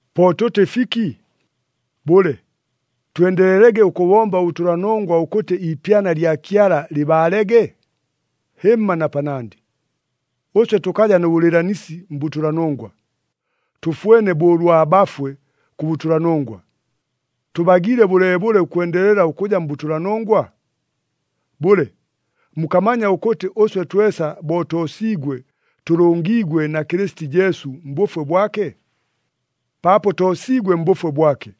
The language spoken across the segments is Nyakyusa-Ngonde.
Po tʉtɨ fiki? Bʉle, twendelelege ʉkʉbomba ʉbʉtʉlanongwa ʉkʉtɨ iipyana lya Kyala lɨbaalege? Hɨmma na panandɨ! Ʉswe tʉkaja nʉ bʉlɨɨlanisi mbʉtʉlanongwa, tʉfwene bo ʉlwa bafwe kʉ bʉtʉlanongwa. Tʉbagiile bʉleebʉle ʉkwendelela ʉkʉja mbʉtʉlanongwa? Bʉle, mukamanya ʉkʉtɨ ʉswe twesa bo toosiigwe, tʉlʉngiigwe na Kɨlɨsiti Jesu mbʉfwe bwake? Paapo toosiigwe mbʉfwe bwake,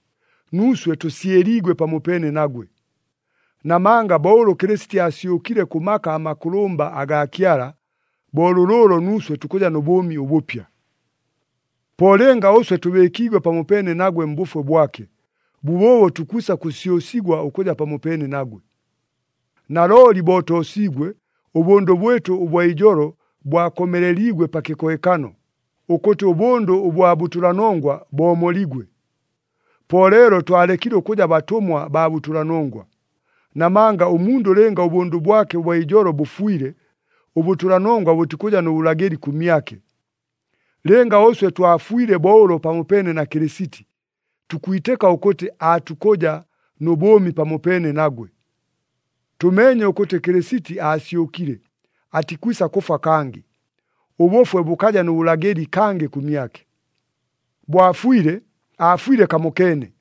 nuuswe tʉsyɨliigwe pamopeene nagwe. Namanga bo ʉlʉ Kɨlɨsiti aasyʉkile kʉ maka amakʉlʉmba agaa Kyala, bo lʉlʉʉlo nuuswe tukʉja nʉ bʉʉmi ʉbʉpya. Po lɨnga ʉswe tʉbɨɨkiigwe pamopeene nagwe mbʉfwe bwake, bʉbʉʉbo tukwisa kʉsyʉsigwa ʉkʉja pamopeene nagwe. Nalooli bo toosiigwe, ʉbʉndʉ bwɨtʉ ʉbwa ijolo bwakomeleliigwe pa kɨkohekano, ʉkʉtɨ ʉbʉndʉ ʉbwa bʉtʉlanongwa boomoligwe. Po leelo twalekile ʉkʉja batʉmwa baa bʉtʉlanongwa. Namanga ʉmundʉ lɨnga ʉbʉndʉ bwake ʉbwa ijolo bʉfwile, ʉbʉtʉlanongwa bʉtikʉja nʉ bʉlagɨli kʉmyake. Lɨnga ʉswe twafwile bo ʉlo pamopeene na Kɨlɨsiti, tukwitɨka ʉkʉtɨ aatukʉja nʉ bʉʉmi pamopeene nagwe. Tʉmeenye ʉkʉtɨ Kɨlɨsiti aasyʉkile, atikwisa kʉfwa kangɨ, ʉbʉfwe bʉkaja nʉ bʉlagɨli kangɨ kʉmyake. Bo afwile, aafwile kamokeene,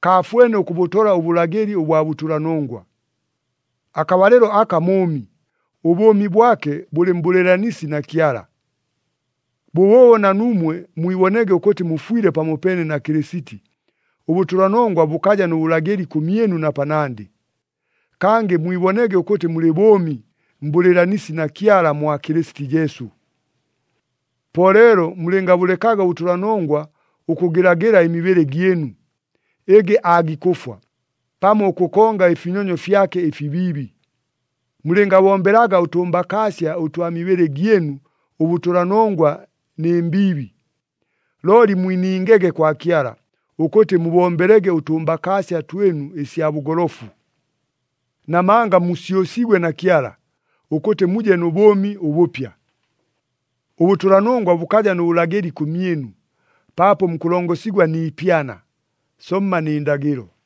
kaafwene ʉkʉbʉtola ʉbʉlagɨli ʉbwa bʉtʉlanongwa. Akabalɨlo aka mʉʉmi, ʉbʉʉmi bwake bʉlɨ mbʉlɨɨlanisi na Kyala. Bʉbʉʉbo na nuumwe mwibonege ʉkʉtɨ mufwile pamopeene na Kɨlɨsiti, ʉbʉtʉlanongwa bʉkaja nʉ bʉlagɨli kʉmyɨnu na panandɨ. Kangɨ mwibonege ʉkʉtɨ mulɨ bʉʉmi mbʉlɨɨlanisi na Kyala mwa Kɨlɨsiti Jesu. Po leelo mulɨngabʉlekaga ʉbʉtʉlanongwa ʉkʉgɨlagɨla ɨmibɨlɨ gyɨnu, ɨgɨ aagikʉfwa, pamo ʉkʉkonga ɨfinyonyo fyake ɨfibiibi. Mulɨngabombelaga ʉtʉmbakaasya ʉtwa mibɨlɨ gyɨnu ʉbʉtʉlanongwa nɨ mbiibi. Looli mwiningege kwa Kyala, ʉkʉtɨ mubombelege ʉtʉmbakaasya twɨnu ɨsya bʉgolofu. Namanga musyʉsiigwe na Kyala, ʉkʉtɨ muje nʉ bʉʉmi ʉbʉpya. Ʉbʉtʉlanongwa bʉkaja nʉ bʉlagɨli kʉmyɨnu, paapo mukʉlongosigwa ni ipyana, somma nɨ ndagɨlo.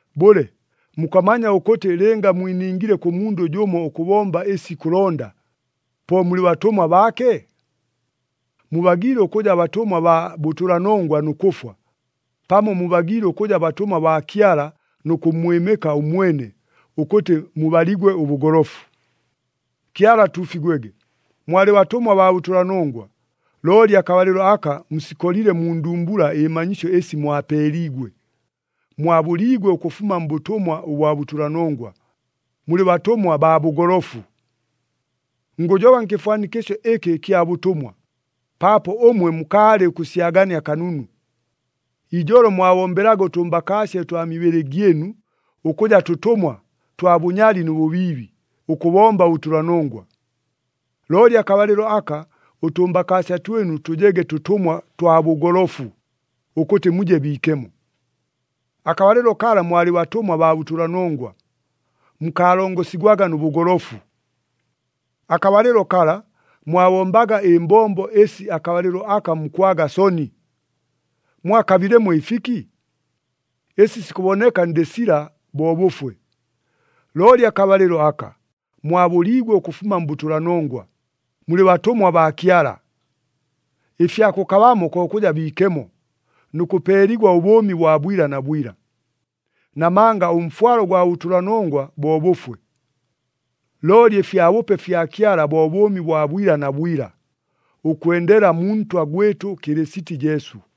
Bʉle, mukamanya ʉkʉtɨ lɨnga mwiningile kʉ mundʉ jʉmo ʉkʉbomba ɨsi ikʉlonda, po mulɨ batʉmwa baake? Mubagiile ʉkʉja batʉmwa baa bʉtʉlanongwa nʉ kʉfwa, pamo mubagiile ʉkʉja batʉmwa baa Kyala nʉ kʉmmwɨmɨka ʉmwene, ʉkʉtɨ mubaligwe ʉbʉgolofu. Kyala atuufigwege! Mwalɨ batʉmwa baa bʉtʉlanongwa, looli akabalɨlo aka musikolile mu ndumbula ɨmanyisyo ɨsi mwapeeliigwe. Mwabʉliigwe ʉkʉfuma mbʉtʉmwa ʉbwa bʉtʉlanongwa, mulɨ batʉmwa baa bʉgolofu. Ngʉjoba nkɨfwanikɨsyo ɨkɨ ɨkya bʉtʉmwa, paapo ʉmwe mukaalɨ ʉkʉsyagania kanunu. Ijolo mwabombelaga ʉtʉmbakaasya ʉtwa mibɨlɨ gyɨnu, ʉkʉja tʉtʉmwa twa bʉnyali nʉ bʉbiibi, ʉkʉbomba ʉbʉtʉlanongwa. Looli akabalɨlo aka ʉtʉmbakaasya twɨnu tʉjege tʉtʉmwa twa bʉgolofu, ʉkʉtɨ muje biikemo. Akabalɨlo kala mwalɨ batʉmwa baa bʉtʉlanongwa, mukaalongosigwaga nʉ bʉgolofu. Akabalɨlo kala, mwabombaga ɨmbombo ɨsi akabalɨlo aka mukwaga soni. Mwakabilemo ɨfiki? Ɨsi sikʉboneka ndɨ sila bo bʉfwe! Looli akabalɨlo aka, mwabʉliigwe ʉkʉfuma mbʉtʉlanongwa, mulɨ batʉmwa baa Kyala. Ɨfya kʉkabamo ko kʉja biikemo, nʉ kʉpeeligwa ʉbʉʉmi bwa bwila na bwila. Namanga ʉmfwalo gwa batʉlanongwa bo bʉfwe. Looli ɨfyabʉpe fya Kyala bo bʉʉmi bwa bwila na bwila, ʉkwendela mu Ntwa gwɨtʉ Kɨlɨsiti Jesu.